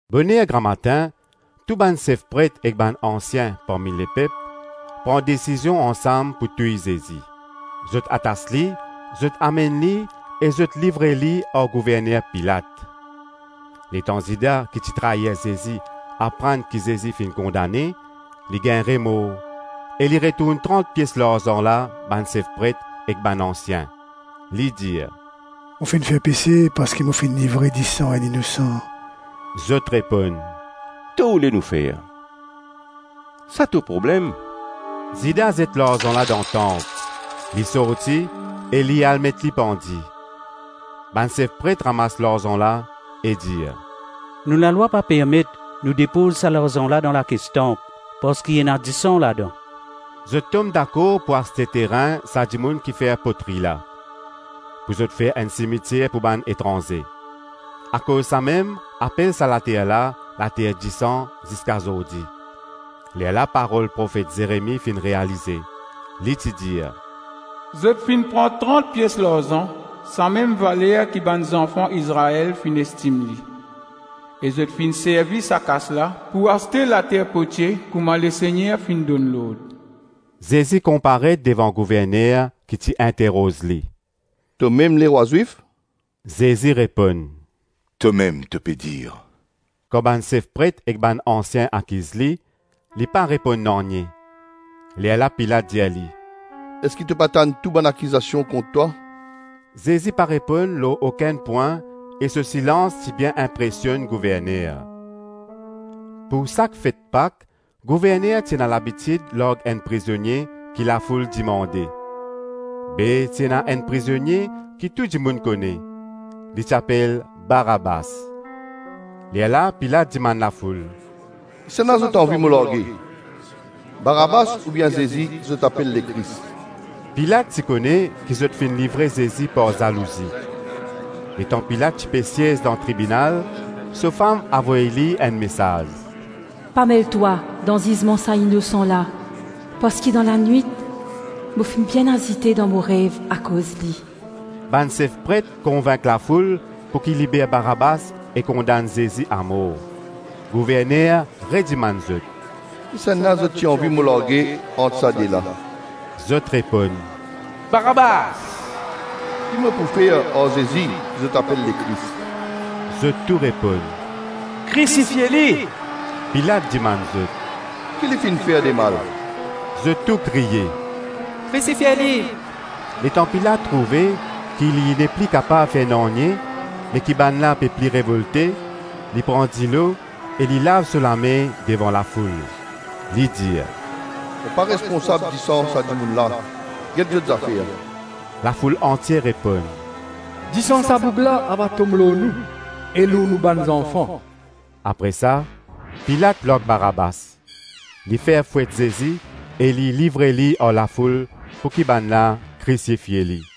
Boner gramatin, tou bann sef pret ek bann ansien parmi lepep pran desizion ansam pou touy Zezi. Zot atas li, zot amenn li e zot livre li ar gouverner Pilat. Letan Zida ki ti trair Zezi aprann ki Zezi finn kondane, li gagn remor e li retourn trant pies larzan la bann sef pret ek bann ansien. Li dir, “Mo finn fer pese parski mo finn livre disan enn inosan.” Zot reponn, “Ki to oule nou fer? Sa to problem.” Zida zet larzan la dan tanp. Li sorti e li al met li pandi. Bann sef pret ramas larzan la e dir, “Nou lalwa pa permet nou depoz sa larzan la dan lakes tanp parski ena disan ladan.” Zot tom dakor pou aste terin sa dimoun kifer potri la, pou zot fer enn simitier pou bann etranze. Akoz samem apel sa later la “Later disan” ziska zordi. Lerla parol profet Zeremi finn realize. Li ti dir, “Zot finn pran trant pies larzan, samem valer ki bann zanfan Izrael finn estim li, e zot finn servi sa kas la pou aste later potie kouma Lesegner finn donn lord.” Zezi konparet devan gouverner ki ti interoz li, “Tomem lerwa Zwif?” Zezi reponn, “Tomem to pe dir.” Kan bann sef pret ek bann ansien akiz li, li pa reponn nanye. Lerla Pilat dir li, “Eski to pa tann tou bann akizasion kont twa?” Zezi pa reponn lor okenn pwin e so silans ti bien inpresionn gouverner. Pou sak fet Pak, gouverner ti ena labitid larg enn prizonie ki lafoul dimande. Be, ti ena enn prizonie ki tou dimoun kone. Li ti apel Barabas. Lerla Pilat dimann lafoul, “Kisannla zot anvi mo large - Barabas oubien Zezi ki zot apel Lekris?” Pilat ti kone ki zot finn livre Zezi par zalouzi. Letan Pilat ti pe siez dan tribinal, so fam avoy li enn mesaz, “Pa mel twa dan zizman sa inosan la parski dan lanwit, mo finn bien azite dan mo rev akoz li.” Bann sef pret konvink lafoul pouki liber Barabas e kondann Zezi amor. Gouverner redimann zot, “Kisannla zot ti anvi mo large ant sa de la?” Zot reponn, “Barabas.” “Ki mo pou fer ar Zezi ki zot apel Lekris?” Zot tou reponn, “Krisifie li.” Pilat dimann zot, “Ki li finn fer demal?” Zot tou kriye, “Krisifie li.” Letan Pilat trouve ki li nepli kapav fer nanye me ki bann la pe pli revolte, li pran dilo e li lav so lame devan lafoul; li dir, “Mo pa responsab disan sa dimoun la; get zot zafer.” Lafoul antie reponn, “Disan sa boug la ava tom lor nou e lor nou bann zanfan.” Apre sa, Pilat larg Barabas, li fer fwet Zezi e li livre li ar lafoul pouki bann la krisifie li.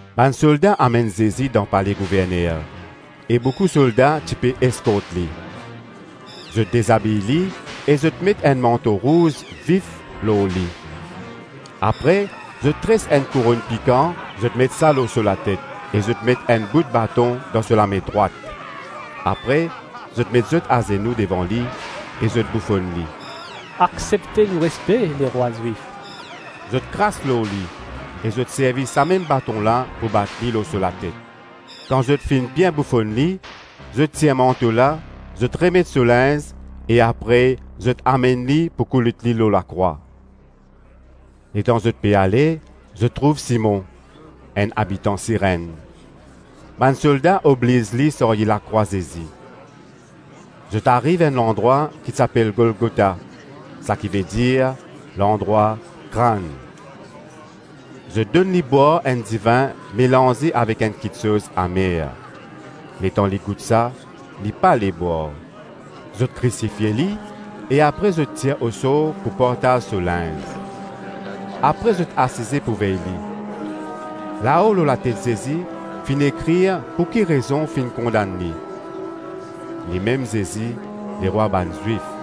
Bann solda amenn Zezi dan pale gouverner e boukou solda ti pe eskort li. Zot dezabiy li e zot met enn manto rouz vif lor li. Apre zot tres enn kouronn pikan, zot met sa lor so latet e zot met enn bout baton dan so lame drwat. Apre zot met zot azenou devan li e zot boufonn li, “Aksepte nou respe, Lerwa Zwif.” Zot kras lor li e zot servi samem baton la pou bat li lor so latet. Kan zot finn bien boufonn li, zot tir manto la, zot remet so linz e apre zot amenn li pou koulout li lor lakrwa. Letan zot pe ale, zot trouv Simon, enn abitan Sirenn; bann solda obliz li sarye lakrwa Zezi. Zot ariv enn landrwa ki ti apel Golgota, sakivedir, “Landrwa Krann.” Zot donn li bwar enn divin melanze avek enn kiksoz amer; letan li gout sa, li pale bwar. Zot krisifie li e apre zot tir osor pou partaz so linz. Apre zot asize pou vey li. Lao lor latet Zezi finn ekrir pouki rezon finn kondann li, “Limem Zezi Lerwa bann Zwif.”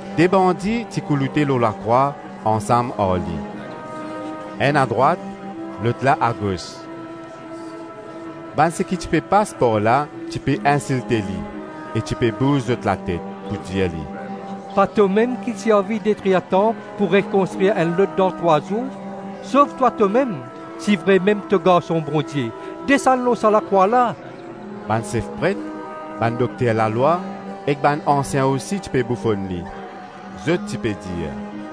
De bandi ti kouloute lor lakrwa ansam ar li. Enn adrwat, lot la agos. Bann seki ti pe pas par la ti pe insilte li e ti pe bouz zot latet pou dir li, “Pa tomem ki ti anvi detrir tanp pou rekonstrir enn lot dan trwa zour; sov twa tomem; si vremem to Garson Bondie, desann lor sa lakrwa la!” Bann sef pret, bann dokter lalwa ek bann ansien osi ti pe boufonn li. Zot ti pe dir,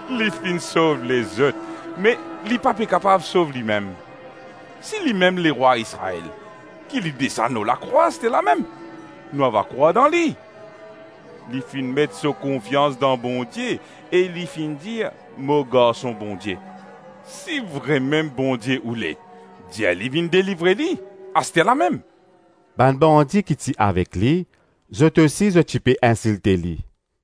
“Li finn sov lezot me li pa pe kapav sov limem! Si limem lerwa Izrael, ki li desann lor lakrwa asterlamem, nou ava krwar dan li. Li finn met so konfians dan Bondie e li finn dir, ‘Mo Garson Bondie.’ Si vremem Bondie oule, dir li vinn delivre li asterlamem.” Bann bandi ki ti avek li, zot osi zot ti pe insilte li.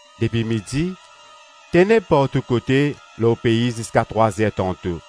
Depi midi teneb partou kote lor pei ziska trwa-zer tanto.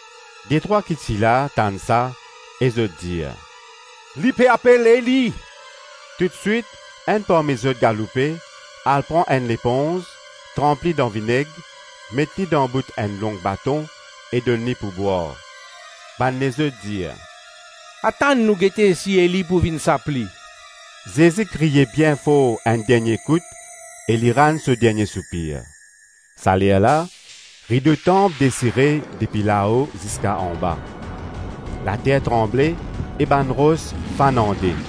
Detrwa ki ti la tann sa e zot dir, “Li pe apel Eli!” Toutswit enn parmi zot galoupe, al pran enn leponz, tranp li dan vineg, met li dan bout enn long baton e donn li pou bwar. Bann lezot dir, “Atann, nou gete si Eli pou vinn sap li.” Zezi kriye bien for enn dernie kout e li rann so dernie soupir. Salerla, rido tanp desire depi lao ziska anba; later tranble e bann ros fann an-de.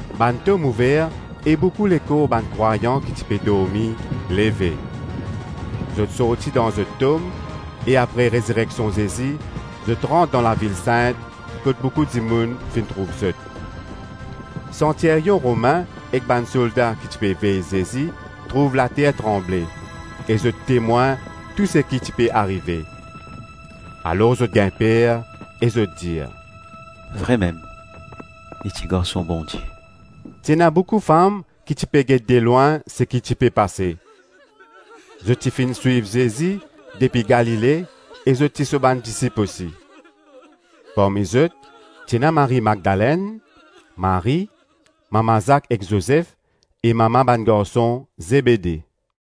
Bann tom ouver e boukou lekor bann krwayan ki ti pe dormi leve. Zot sorti dan zot tom e apre rezireksion Zezi, zot rant dan lavil sint kot boukou dimoun finn trouv zot. Santiryon Romin ek bann solda ki ti pe vey Zezi trouv later tranble e zot temwin tou seki ti pe arive. Alor zot gagn per e zot dir, “Vremem li ti Garson Bondie.” Ti ena boukou fam ki ti pe get delwin seki ti pe pase. Zot ti finn swiv Zezi depi Galile e zot ti so bann disip osi. Parmi zot, ti ena Marie Magdalenn, Marie, mama Zak ek Zozef e mama bann garson Zebede.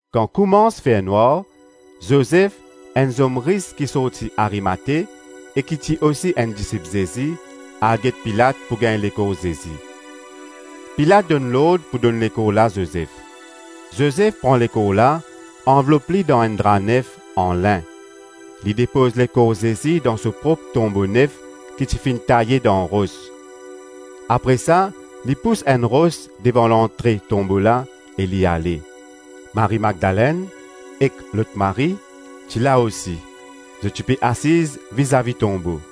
Kan koumans fer nwar, Zozef, enn zom ris ki sorti Arimate e ki ti osi enn disip Zezi, al get Pilat pou gagn lekor Zezi. Pilat donn lord pou donn lekor la Zozef. Zozef pran lekor la, anvlop li dan enn dra nef an lin. Li depoz lekor Zezi dan so prop tonbo nef ki ti finn taye dan ros. Apre sa li pous enn ros devan lantre tonbo la e li ale. Marie-Madlenn ek lot Marie, ti la osi. Zot ti pe asiz vizavi tonbo.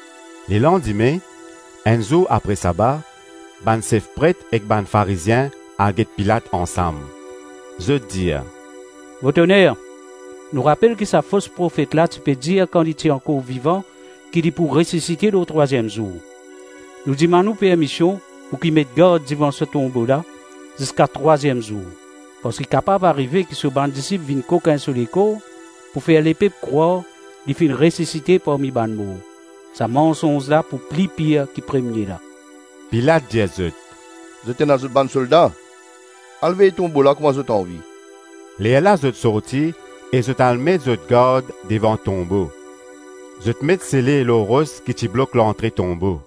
Lelandime, enn zour apre saba, bann sef pret ek bann Farizien al get Pilat ansam. Zot dir, “Vot oner, nou rapel ki sa fos profet la ti pe dir kan li ti ankor vivan ki li pou resisite lor trwaziem zour. Nou dimann ou permision pouki met gard devan sa tonbo la ziska trwaziem zour; parski kapav arive ki so bann disip vinn kokin so lekor pou fer lepep krwar, ‘Li finn resisite parmi bann mor.’ Sa mansonz la pou pli pir ki premie la.” Pilat dir zot, “Zot ena zot bann solda. Al vey tonbo la kouma zot anvi.” Lerla zot sorti e zot al met zot gard devan tonbo; zot met sele lor ros ki ti blok lantre tonbo.